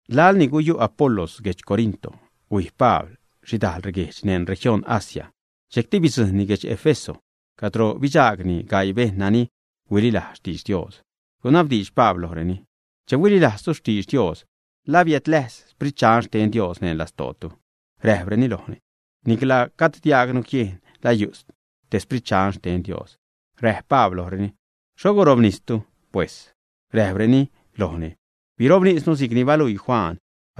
Laḻ ni guyu' Apolos guedx Corinto, huij Pabl xhidajl reguejdx neṉ región Asia, dxejcti bidzujṉni guedx Éfeso cadro bidxaagni gaii bejṉ nani huililajz xtidx Dios. Gunabdiidx Pabl lojreni: ―Che huililajztu xtidx Dios, ¿la biädlajz Sprit Dxan xten Dios neṉ lastootu, ä? Räjpreni lojni: ―Nicla gajd diajgnu jiejn la yu' te Sprit Dxan xten Dios. Räjp Pabl lojreni: ―¿Xho birobnistu, pues? Räjpreni lojni: ―Birobnisnu si'cni baluii Juan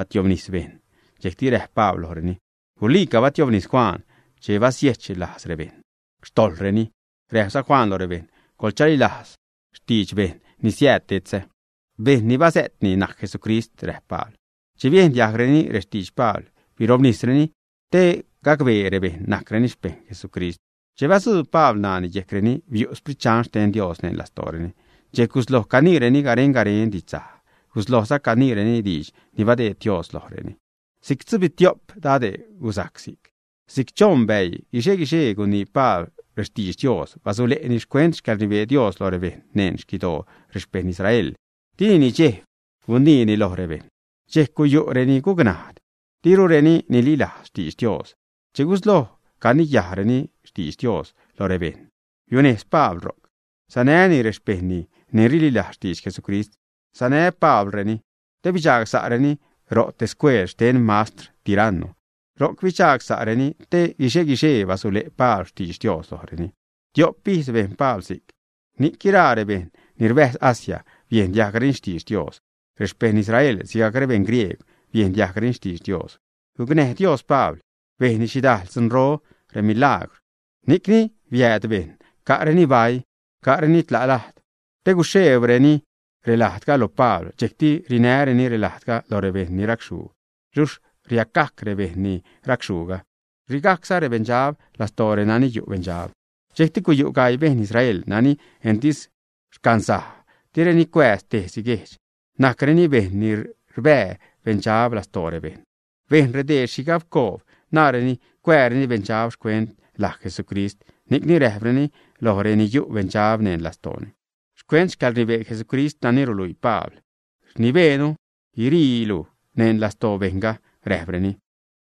tiobnis bejṉ. Dxejcti räjp Pabl lojreni: ―Guliica bastiobnis Juan che basiejch lajz rebejṉ xtojḻreni. Räjpza Juan lo rebejṉ: “Coḻchalilajz xtidx bejṉ ni siääd detzä.” Bejṉ ni basä'tni najc Jesucrist ―räjp Pabl. Che biejn diajgreni rextidx Pabl birobnisreni te gacbee rebejṉ najcreni xpejṉ Jesucrist. Che batzuub Pabl ṉaani yejcreni, biu' Sprit Dxan xten Dios neṉ lastooreni. Dxejc gusloj caniireni garen-garen didxsaj. Guslojza caniireni diidx ni badeed Dios lojreni. Si'c tzubitio'p dade' gusajc si'c. Si'c choṉ bäii, guixe-guixee gunii Pabl rextidx Dios, basule'ni xcuent xcäḻrnibee Dios loj rebejṉ neṉ xquidoo rexpejṉ Israel. Dini nidxejb guniini loj rebejṉ. Dxejc guyu' reni gucnajd, dirureni nililajz xtidx Dios. Che gusloj caniyajreni xtidx Dios lo rebejṉ, biunejz Pabl ro'c sanäni rexpejṉni ni rililajz xtidx Jesucrist. Sanä Pablreni te bidxagsa'reni ro scueel xten mastr Tiranno. Ro'c bidxagsa'reni te guixe-guixee basule' Pabl xtidx Dios lojreni. Tiop ijz bejn Pabl si'c, ni'c guiraa rebejṉ ni rbäjz Asia biejn diajgreni xtidx Dios. Rexpejṉ Israel sigajc rebeṉ griegw biejn diajgreni xtidx Dios. Gucnäj Dios Pabl bejnni xhidajl dzunro, remilagwr. Ni'cni biääd bejṉ ca'reni baii, ca'reni tla' lajd te guxheebreni relajdga lo Pabl. Dxejcti rinäreni relajdga lo rebejṉ ni racxhuu, luxh riacgajc rebejṉ ni racxhuuga, ṟigajcza rebeṉdxab lastoo renani yu' beṉdxab. Dxejcti guyu' gaii beṉ Israel nani entis rcansaj, direni cuääz tejsi guejdx. Najcreni bejṉ ni rbää beṉdxab lastoo rebejṉ. Bejn redee xhigabcoob, naareni cuääreni beṉdxab xcuent laj Jesucrist, ni'cni räjpreni lo renani yu' beṉdxab neṉ lastooni: ―Xcuent xcäḻrnibee Jesucrist nani ruluii Pabl rnibeenu guiriilu neṉ lastoo bejṉga ―räjpreni.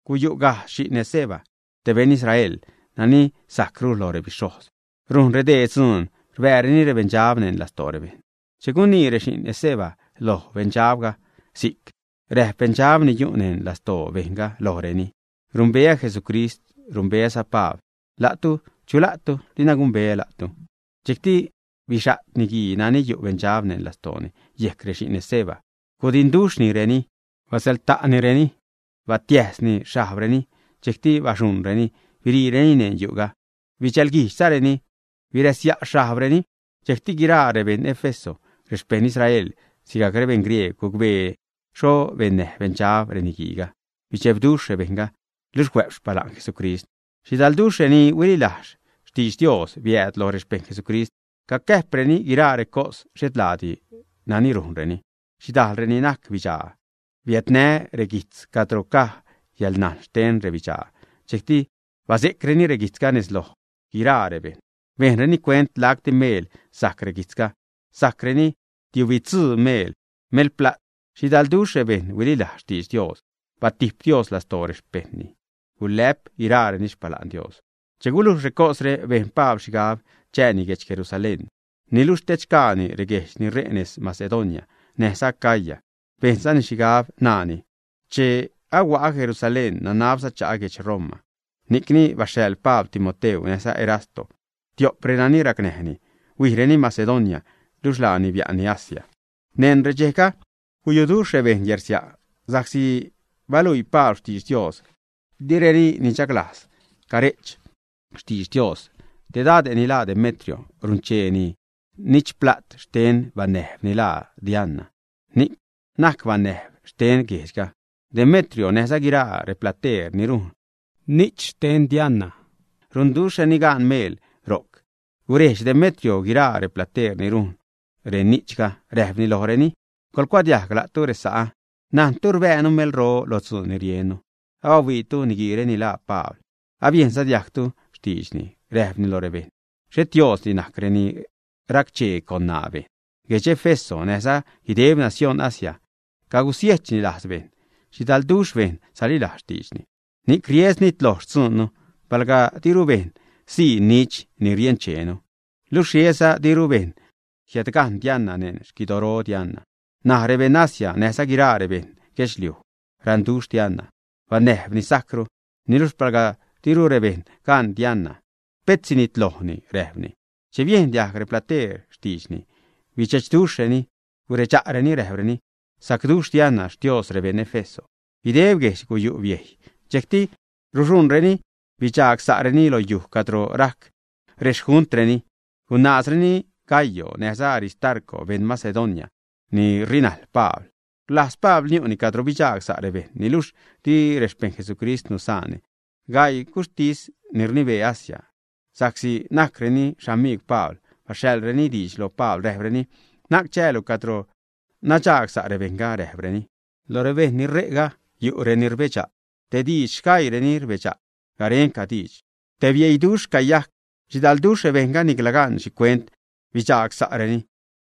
Guyu' gajdz xi'n Esceva, te beṉ Israel, nani sajcru lo rebixhojz. Rujn redee dzuun rbääreni rebeṉdxab neṉ lastoo rebejṉ. Che gunii rexi'n Esceva loj beṉdxabga si'c, räjp beṉdxab ni yu' neṉ lastoo bejṉga lojreni: ―Rumbeä Jesucrist, rumbeäza Pabl. ¿La'tu, chu la'tu? Dina gumbeä la'tu. Dxejcti bixa't niguii nani yu' beṉdxab neṉ lastooni yejc rexi'n Esceva, gudinduxhnireni, basäḻta'nireni, batiäjsni xhajbreni. Dxejcti baxuṉreni biriireni neṉ yu'ga, bidxälguijdxzareni biräsya' xhajbreni. Dxejcti guiraa rebeṉ Éfeso, rexpejṉ Israel sigajc beṉ griegw, gucbee xho bennäj beṉdxab reniguiiga. Bidxebduxh rebejṉga, luxh huä'p xpala'n Jesucrist. Xhidalduxh reni huililajz xtidx Dios biääd lo rexpejṉ Jesucrist. Cacäjpreni guiraa recos xhet laadi nani rujnreni. Xhidajl reni najc bidxaa biädnä reguijtz cadro caj yäḻnajn xten rebidxaa. Dxejcti base'creni reguijtzga nez loj guiraa rebejṉ. Bejnreni cuent lacti meel sajc reguijtzga. Sajcreni tiubitzuu miḻ melpla't. Xhidalduxh rebejṉ huililajz xtidx Dios. Batijp Dios lastoo rexpejṉni. Gulä'p guiraareni xpala'n Dios. Che gulujx recosre, bejn Pabl xhigab chääni guedx Jerusalén, niluxh tedxgaani reguejdx ni ṟe' nez Macedonia näjza Acaya, bejnzani xhigab, naani: ―Che ahua'a Jerusalén, nanabza cha'a guedx Roma. Ni'cni baxhaḻ Pabl Timoteu näjza Erasto, tio'p renani racnäjni, huijreni Macedonia, luxh laani bia'nni Asia. Neṉ redxejga, guyuduxh rebejṉ yärsia' sa'csi baluii Pabl xtidx Dios. Direni nichaglajz care'ch xtidx Dios. Te dade' ni laa Demetrio runchee ni'ch pla't xten banäjb ni laa Diana, ni najc banäjb xten guejdxga. Demetrio näjza guiraa replateer ni rujn ni'ch xten Diana runduxhreni gaan meel ro'c. Gurejdx Demetrio guiraa replateer ni rujn reni'chga, räjpni lojreni: ―Coḻcuadiajg, la'tu resa'ä: najntu rbäänu melro lo dzuun ni riennu. Abahuiitu niguiire ni laa Pabl. Abiejnza diajgtu xtiidxni. Räjpni lo rebejṉ: “Xhet diosdi najc reni racchee con ṉaa bejṉ.” Guedx Éfeso näjza guideb nacióṉ Asia cagusiejchni lajz bejṉ, xhidalduxh bejṉ salilajz xtiidxni. Ni'c ries nitloj xtzuunnu palga diru bejṉ sii ni'ch ni riencheenu. Luxh riesza diru bejṉ jiädgajṉ Diana neṉ xquidoro Diana. N̲aj rebeṉ Asia, näjza guiraa rebeṉ guedxliuj raṉduxh Diana, banäjb ni sajcru, niluxh palga diru rebejṉ gaṉ Diana, pet sinitlojni ―räjpni. Che biejn diajg replateer xtiidxni, bidxe'chduxhreni, guredxa'reni räjpreni: ―Sacduxh Diana xtios rebeṉ Éfeso. Guideb guejdx guyu' biejy. Dxejcti ruxuṉreni bidxagsa'reni lo yuj cadro rajc rexjuntreni. Gunaazreni Gayo näjza Aristarco, beṉ Macedonia ni rinajl Pabl. Rlajz Pabl niu'ni cadro bidxagsa' rebejṉ, niluxh di rexpejṉ Jesucrist nusaanni. Gaii guxhtis ni rnibee Asia, sa'csi najcreni xamijgw Pabl, baxhaḻreni diidx lo Pabl, räjpreni: ―Na'c chäälu cadro nadxagsa' rebejṉga ―räjpreni. Lo rebejṉ ni ṟe'ga, yu' reni rbedxa' tej diidx, sgaiireni rbedxa' garenca diidx. Te bieiduxh cayajc. Xhidalduxh rebejṉga nicla gan xhicuent bidxagsa'reni.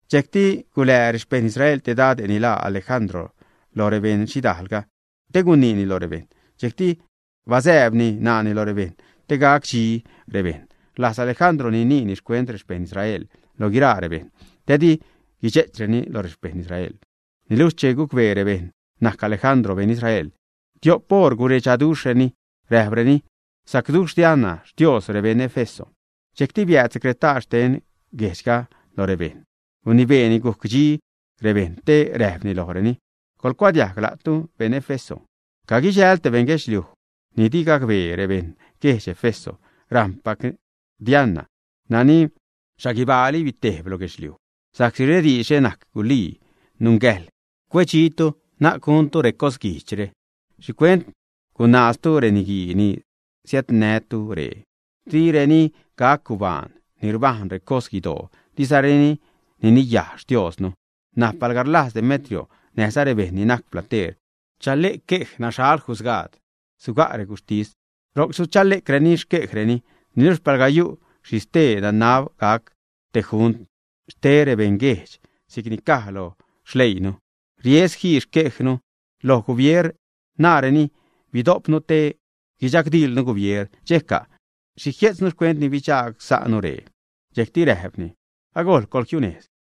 Dxejcti gulää rexpejṉ Israel te dade' ni laa Alejandro lo rebeṉ xhidaalga, te guiniini lo rebejṉ. Dxejcti basääbni ṉaani lo rebejṉ te gac dxi rebejṉ. Rlajz Alejandro guiniini xcuent rexpejṉ Israel loj guiraa rebejṉ, te di guidxe'chreni lo rexpejṉ Israel. Niluxh che gucbee rebejṉ najc Alejandro beṉ Israel, tiop oṟ guredxaduxhreni, räjpreni: ―Sacduxh Diana xtios rebeṉ Éfeso. Dxejcti biääd secretaar xten guejdxga lo rebejṉ, gunibeeni guc dxi rebejṉ, te räjpni lojreni: ―Coḻcuadiajg, la'tu beṉ Éfeso, caguidxäjḻ te beṉ guedxliuj ni di gacbee rebeṉ guedx Éfeso rajṉpac Diana, nani xhaguibaali bitejb lo guedxliuj. Sa'csi rediidxre najc gulii, nungäjḻ cuedxitu, na'c guntu recos guijdxre. ¿Xhicuent gunaaztu reniguii ni siädnätu ree? Direni gac gubaan ni rbajn recos guidoo, dizareni niniyaj xtiosnu. N̲aj palga rlajz Demetrio näjza rebejṉ ni najc plateer chale'c quej, naxhal jusgaad, suga' reguxhtis. Ro'c suchale'creni xquejreni. Niluxh palga yu' xhi stee, nanab gac te junt xte rebeṉguejdx si'c ni caj lo xleiinu. Ries jii xquejnu lo gubier, naareni bidojpnu te guidxagdiḻnu gubier. ¿Dxejca'? ¿Xhi jie'tznu xcuent ni bidxagsa'nu ree? Dxejcti räjpni: ―Agojl, coḻjiunejz.